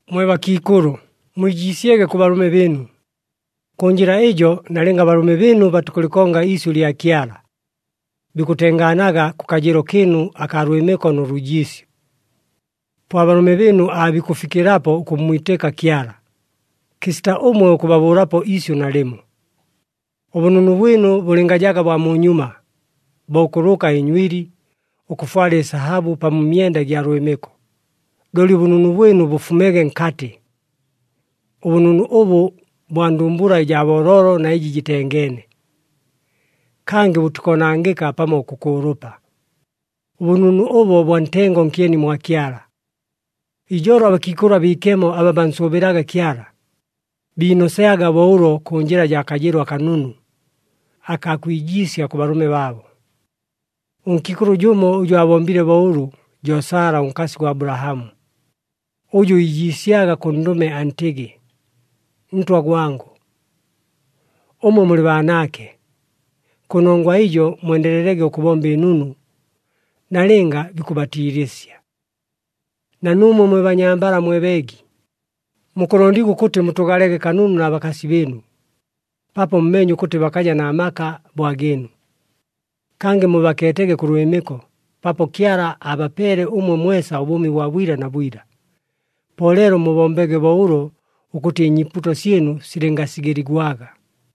Mwe bakiikʉlʉ, mwijiisyege kʉ balʉme bɨɨnu. Kʉ njɨla ɨjo, nalɨnga abalʉme bɨɨnu batikʉlɨkonga iisyʉ lya Kyala, bikʉtengaanaga kʉ kajɨɨlo kɨɨnu akaa lwɨmɨko nʉ lwijiisyo. Po abalʉme bɨɨnu aabikʉfikɨlapo ʉkʉmmwitɨka Kyala, kɨsita ʉmwe ʉkʉbabʉʉlapo iisyʉ nalɨmo. Ʉbʉnunu bwɨnu bʉlɨngajaga bwa munyuma, bo ʉkʉlʉka ɨnywili, ʉkʉfwala ɨsahabʉ pamo ɨmyenda ɨgya lwɨmɨko, looli ʉbʉnunu bwɨnu bʉfumege nkatɨ. Ʉbʉnunu ʉbʉ bwa ndumbula ɨjaa booloolo na ɨjɨ jɨtengeene. Kangɨ bʉtikoonangɨka pamo ʉkʉkʉʉlʉpa. Ʉbʉnunu ʉbo bwa ntengo nkyeni mwa Kyala. Ijolo abakiikʉlʉ abiikemo aba bansʉʉbɨlaga Kyala, biinosyaga bo ʉlo kʉ njɨla jaa kajɨɨlo akanunu, akaa kwijiisya kʉ balʉme baabo. Ʉnkiikʉlʉ jʉmo ʉjʉ aabombile bo ʉlʉ jo Sala ʉnkasi gwa Abulahamu, ʉjʉ iijiisyaga kʉ ndʉme antɨgɨ, “Ntwa gwangʉ.” Ʉmwe mulɨ baanaake. Kʉnongwa ɨjo mwendelelege ʉkʉbomba ɨnunu, nalɨnga bikʉbatiilɨsya. Na nuumwe mwe banyambala mwe beegi, mukʉlondigwa ʉkʉtɨ mutʉʉgalege kanunu na bakasi bɨɨnu, paapo mumeenye ʉkʉtɨ bakaja na maka bo agɨɨnu. Kangɨ mubakeetege kʉ lwɨmɨko, paapo Kyala abapeele ʉmwe mwesa ʉbʉʉmi bwa bwila na bwila. Po leelo mubombege bo ʉlo ʉkʉtɨ ɨnyiipuuto syɨnu silɨngasigɨligwaga.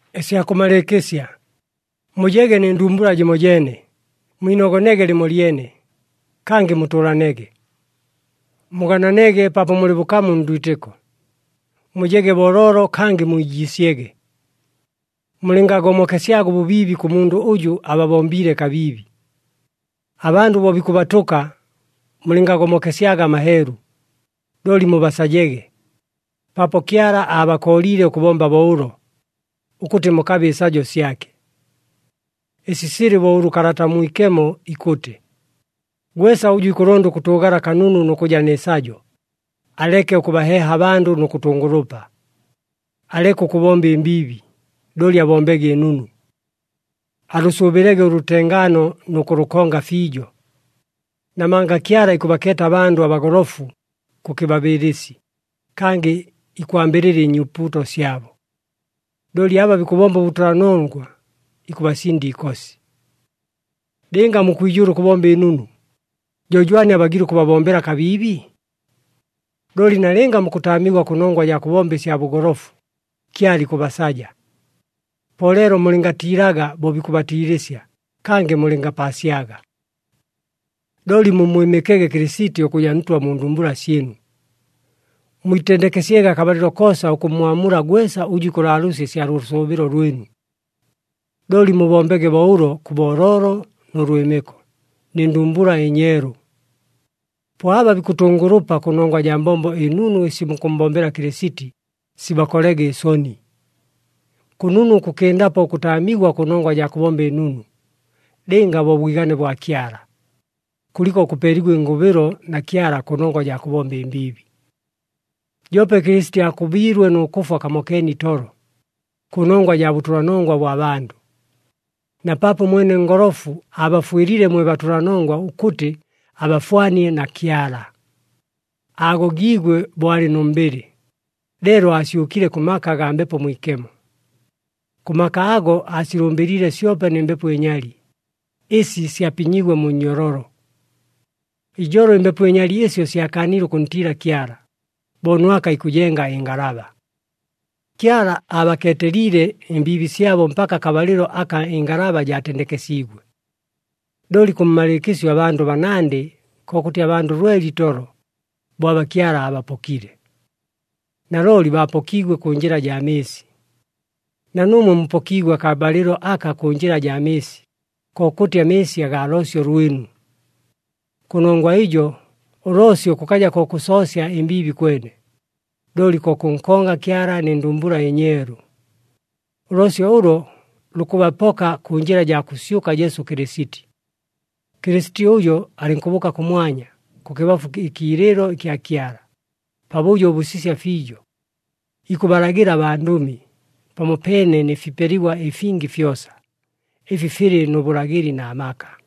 Ɨsya kʉmalɨɨkɨsya, mujege nɨ ndumbula jɨmojeene, mwinogonege lɨmolyene, kangɨ mutʉʉlanege. Mugananege paapo mulɨ bʉkamu ndwitɨko, mujege booloolo kangɨ mwijiisyege. Mulɨngagomokesyaga ʉbʉbiibi kʉ mundʉ ʉjʉ ababombiile kabiibi. Abandʉ bo bikʉbatʉka, mulɨngagomokesyaga amaheelu, looli mubasajege. Paapo Kyala aabakooliile ʉkʉbomba bo ʉlo, ʉkʉtɨ mukabe ɨsajo syake. Ɨsi silɨ bo ʉlʉ Kalata ʉMwikemo ikʉtɨ, “Gwesa ʉjʉ ikʉlonda ʉkʉtʉʉgala kanunu nʉ kʉja nɨ sajo, aleke ʉkʉbaheeha abandʉ nʉ kʉtʉngʉlʉpa. Aleke ʉkʉbomba ɨmbiibi, looli abombege ɨnunu. Alʉsʉʉbɨlege ʉlʉtengaano nʉ kʉlʉkonga fiijo. Namanga Kyala ikʉbakeeta abandʉ abagolofu kʉ kɨbabɨɨlɨsi, kangɨ ikwambɨlɨla ɨnyiipuuto syabo. Looli aba bikʉbomba ʉbʉtʉlanongwa, ikʉbasinda iikosi.” Lɨnga mukwijʉʉla ʉkʉbomba ɨnunu, jo jwani abagiile ʉkʉbabombela kabiibi? Looli nalɨnga mukʉtaamigwa kʉnongwa jaa kʉbomba ɨsya bʉgolofu, Kyala ikʉbasaja. Po leelo mulɨngatiilaga bo bikʉbatiilɨsya, kangɨ mulɨngapaasyaga. Looli mummwɨmɨkege Kɨlɨsiti ʉkʉja Ntwa mu ndumbula syɨnu. Mwitendekesyege akabalɨlo koosa ʉkʉmmwamula gwesa ʉjʉ ikʉlaalʉʉsya ɨsya lʉsʉʉbɨlo lwɨnu. Looli mubombege bo ʉlo kʉ booloolo nʉ lwɨmɨko, nɨ ndumbula ɨnyeelu. Po aba bikʉtʉngʉlʉpa kʉnongwa jaa mbombo ɨnunu ɨsi mukʉmmbombela Kɨlɨsiti, sibakolege ɨsoni. Kʉnunu ʉkʉkɨndapo ʉkʉtaamigwa kʉnongwa jaa kʉbomba ɨnunu, lɨnga bo bwigane bwa Kyala, kʉliko ʉkʉpeeligwa ɨngʉbɨlo na Kyala kʉnongwa jaa kʉbomba ɨmbiibi. Joope Kɨlɨsiti aakʉbiilwe nʉ kʉfwa kamokeene itolo, kʉnongwa jaa bʉtʉlanongwa bwa bandʉ. Na paapo ʉmwene ngolofu, aabafwɨliile mwe batʉlanongwa ʉkʉtɨ abafwanie na Kyala. Aagogiigwe bo alɨ nʉ mbɨlɨ, leelo aasyʉkile kʉ maka agaa Mbepo Mwikemo. Kʉ maka ago aasilʉmbɨliile syope nɨ mbepo ɨnyali, ɨsi syapinyiigwe mu nnyololo. Ijolo ɨmbepo ɨnyali ɨsyo syakaanile ʉkʉntiila Kyala, bo Nwaka ikʉjenga ɨngalaba. Kyala aabakeeteliile ɨmbiibi syabo mpaka akabalɨlo aka ɨngalaba jaatendekesiigwe. Looli kʉmmalɨɨkɨsyo abandʉ banandɨ, kokʉtɨ abandʉ lwele itolo, bo aba Kyala aabapokile. Nalooli baapokiigwe kʉ njɨla jaa mɨɨsi. Na nuumwe mupokiigwe akabalɨlo aka kʉ njɨla jaa mɨɨsi, kokʉtɨ amɨɨsi agaa loosyo lwɨnu. Kʉnongwa ɨjo, ʉloosyo kʉkaja ko kʉsoosya ɨmbiibi kwene, looli ko kʉnkonga Kyala nɨ ndumbula ɨnyeelu. Ʉloosyo ʉlo lukʉbapoka kʉ njɨla jaa kʉsyʉka Jesu Kɨlɨsiti. Kɨlɨsiti ʉjo alɨnkʉbʉʉka kʉmwanya, kʉkɨbafu ɨkiilɨɨlo kya Kyala, pabʉjo ʉbʉsisya fiijo. Ikʉbalagɨla abandʉmi, pamopeene nɨ fipeligwa ɨfingi fyosa, ɨfi filɨ nʉ bʉlagɨli na maka.